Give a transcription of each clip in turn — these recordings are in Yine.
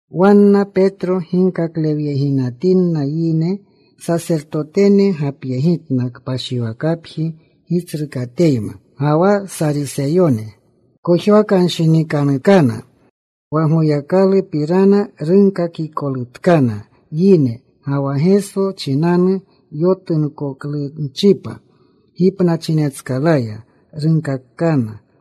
Wanna Petro ginkaklewyeginatinna yine, sasertotene gapyegitna kpashiwakapji gitsrukateyma ga wa Sariseyone. Kojwakanshinikanutkana wa Goyakalupirana runkakikolutkana yine, ga wa Geso chinanu yotunkoklunchipa gipnachinetskalaya runkaakana.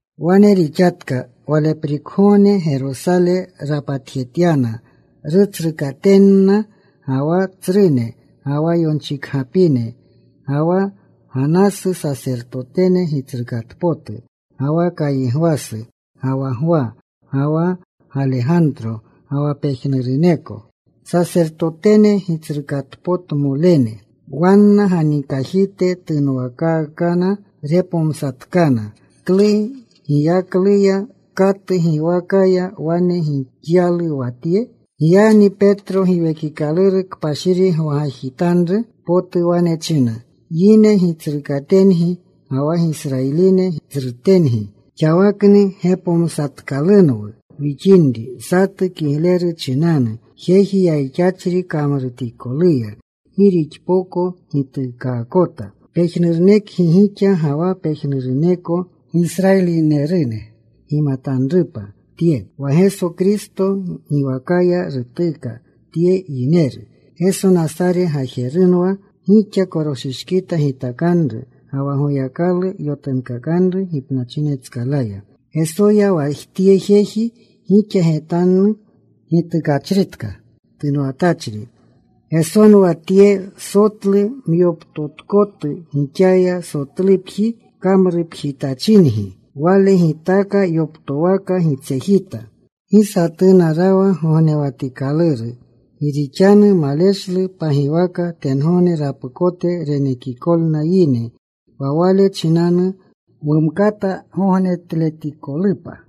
Wane rixatka waleprikgogne Gerosale rapatjetyana rutsrukatenna, ga wa tsrune, ga wa yonchikgapine. Ga wa Ganasu Sasertotene Gitsrukatpotu, ga wa Kaygwasu, ga wa Gwa, ga wa Galegantro, ga wa pejnuruneko Sasertotene Gitsrukatpotumolene. Wanna ganikajite tunwakaakana. Repomsatkana, “¿Klu giyakluya, katu giwakaya wane gixyalu wa tye?” Giyagni Petro Giwekikaluru Kpashiri gwagajitanru potu wane chinna, “Yine gitsrukatengi ga wa Gisrayiline tsrutengi, xawakni gepomsatkalunwu wixinri, satu kigleru chinanu, jeji yayixachri kamrutikoluya, gi rixpoko gituukakota. Pejnurunekgi gixa ga wa pejnuruneko Gisrayilinerune gimatanrupa tye: wa Geso Kristo giwakaya rutuka tye yineru. Geso Nasare gajerunwa gixa koroshishkita gitakanru, ga wa Goyakalu yotunkakanru gipnachinetskalaya. Gesoya wa tye jeji gixa getanu gitukachritka tunwatachri. Gesonwa Tye: Sotlu myoptotkotu gixaya sotlupji kamrupjitachingi Wale gitaaka yoptowaka gitsejita. “Gi satuna rawa gognewatikaluru. Gi rixanu maleshlu pagiwaka tengogne rapukote renekikolna yine, wa wale chinanu wumkata gognetletikolupa.”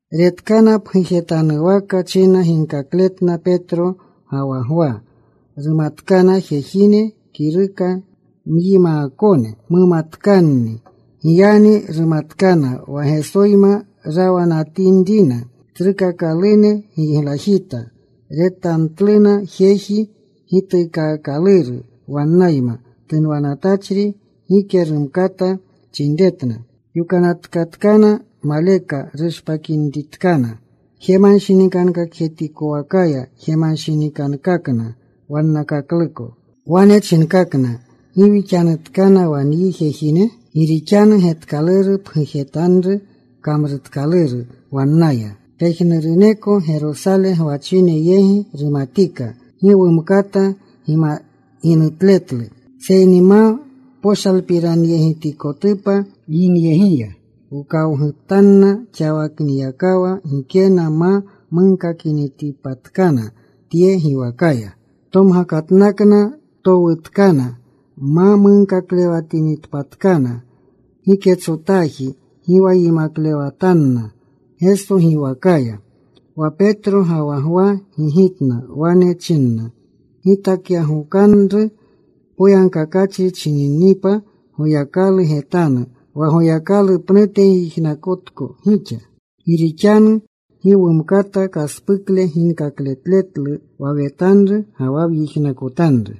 Retkana pgujetanuwaka china ginkakletna Petro ga wa Gwa. Rumatkana jejine kiruka myimaakone, mumatkanni. Giyagni rumatkana wa Gesoyma rawanatinrina. Tsrukakalune giglajita. Retanatluna jeji gituukaakaluru wannayma tunwatachri. Gike rumkata chinretna. Yokanatkatkana maleka rushpakinitkana jemanshinikankakjetikowakaya. Jemanshinikankakna wannakakluko. Wane chinkakna, “¿Gi wixanutkana wa nyi jejine? Gi rixanu getkaluru pgujetanuru kamrutkaluru wannaya. Pejnuruneko Gerosale gwachine yegi rumatika. Gi wumkata ginutletlu. Seyni ma poshalpiranyegitikotupa yinyegiya, wkawgutanna xaniyakawa gikena ma munkakinitpatkana tye giwakaya.” Tomgakatnakna. Towutkana ma munkaklewatinitpatkana giketsotaji, gi wa yimaklewatanna Geso giwakaya. Wa Petro ga wa Gwa gigitna. Wane chinna, “Gitakyagokanru poyagkakachri chininipa Goyakalu getanu, wa Goyakalu pnute gyijnakotko gixa. Gi rixanu gi wumkata kaspukle ginkakletletlu wa wetanru ga wa wyijnakotanru.”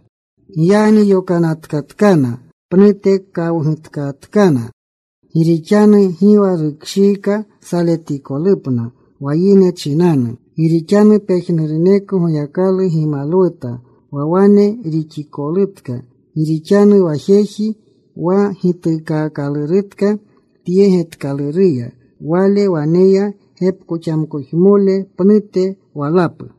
Giyagni yokanatkatkana. Pnute kawgutkatkana, gi rixanu gi wa rukshiika saletikolupna wa yine chinanu. Gi rixanu pejnuruneko Goyakalu gimalwuta wa wane rixikolutka. Gi rixanu wa jeji wa gituukaakalurutka tye getkaluruya, wale waneya gepkoxamkojmole pnute walapu.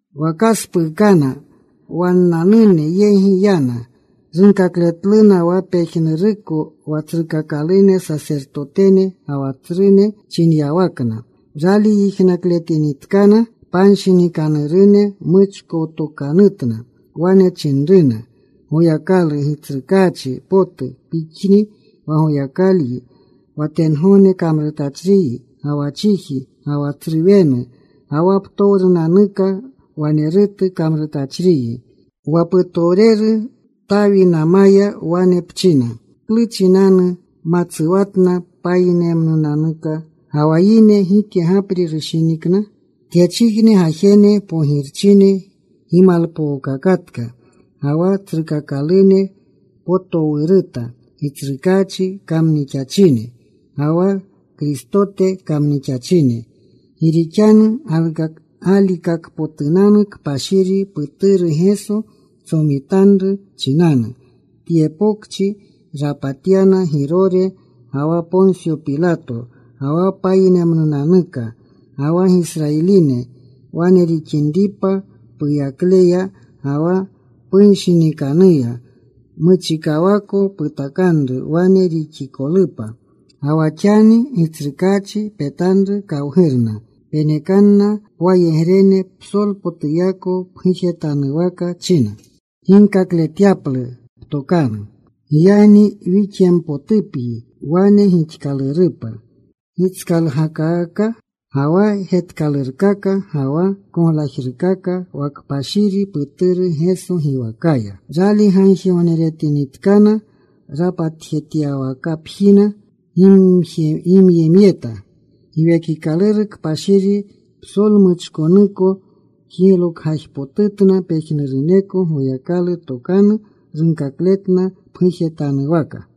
Wa kaspuukana. Wannanune yegi yana. Runkakletluna wa pejnuruko wa tsrukakalune sasertotene ga wa tsrune chinyawakna. Rali yijnakletinitkana, panshinikanurune muchkowtokanutna. Wane chinruna Goyakalu, “Gitsrukaachi potu, Pixni wa Goyakalyi, wa tengogne kamrutachriyi, ga wa chiji, ga wa tsru wenu, ga wa ptowrunanuka wanerutu kamrutachriyi. Wa putowreru Tawinamaya wane pchina: ¿Klu chinanu matsuwatna payinemnunanuka, Ga wa yine gike gapri rushinikna? Tyechijne gajene pogirchine gimalpookakatka, Ga wa tsrukakalune potowruta Gitsrukaachi kamnixachine, Ga wa Kristote kamnixachine. “Gi rixanu galikakpotunanu kpashiri Puturu Geso ptsomitanru chinanu, tye pokchi rapatyana Girore ga wa Ponsyo Pilato, ga wa payinemnunanuka, ga wa Gisrayilinerune. Wane rixinripa puyakleya ga wa pushinikanruya muchikawako putakanru wane rixikolupa. Ga wa xani, Gitsrukaachi, petanru kawgurna. Penekanna pwayegrene psolpotuyako pgujetanwaka china ginkakletyapluna ptokanu. Giyagni wixyempotupyi wane gixkalurkakapa gitskalgalkaka, ga wa getkalurkaka, ga wa koglajrukaka wa kpashiri Puturu Geso giwakaya.” Rali gagjigogneretinitkana, rapatjetyawakapjina gimyemyeta. Giwekikaluru Kpashiri psolmuchkonuko jiglokgajpotutna pejnuruneko. Goyakalu tokanu runkakletna pgujetanuwaka.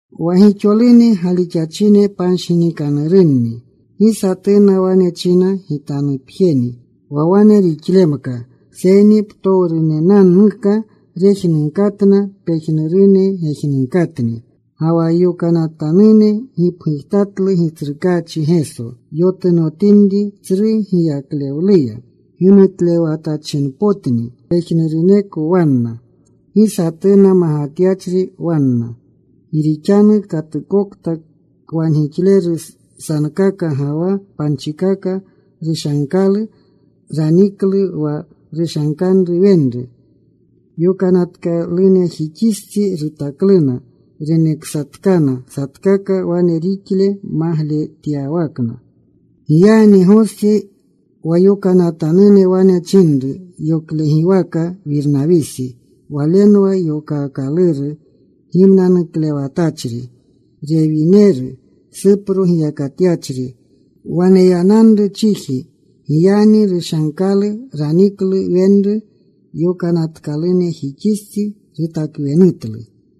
Wa gixolune galixachine panshinikanurunni. Gi satuna wane china, “Gitanupjeni,” wa wane rixlemka, seyni ptowrunanuka rejnunkatna pejnurune gejnunkatni. Ga wa yokanatanune gipgujtatlu Gitsrukaachi Geso yotunotinri tsru giyaklewluya. Gimutlewatachinpotni pejnuruneko wanna. Gi satuna magatyachri wanna. Gi rixanu katukokta kwangixleru sankaka ga wa panchikaka, rushankalu. Raniklu wa rushankanru wenru. Yokanatanunejixistsi rutakluna. Reneksatkana satkaka wane rixa magletyawakna. Giyagni Gosi, wa yokanatanune wane chinanru yoklegiwaka Wirnawisi (walenwa yokaakaluru Gimnanuklewatachri) Rewineru, Supro giyakatyachri. Waneyananru chiji. Giyagni rushankalu. Raniklu wenru. Yokanatkalunejixistsi rutakwenutlu.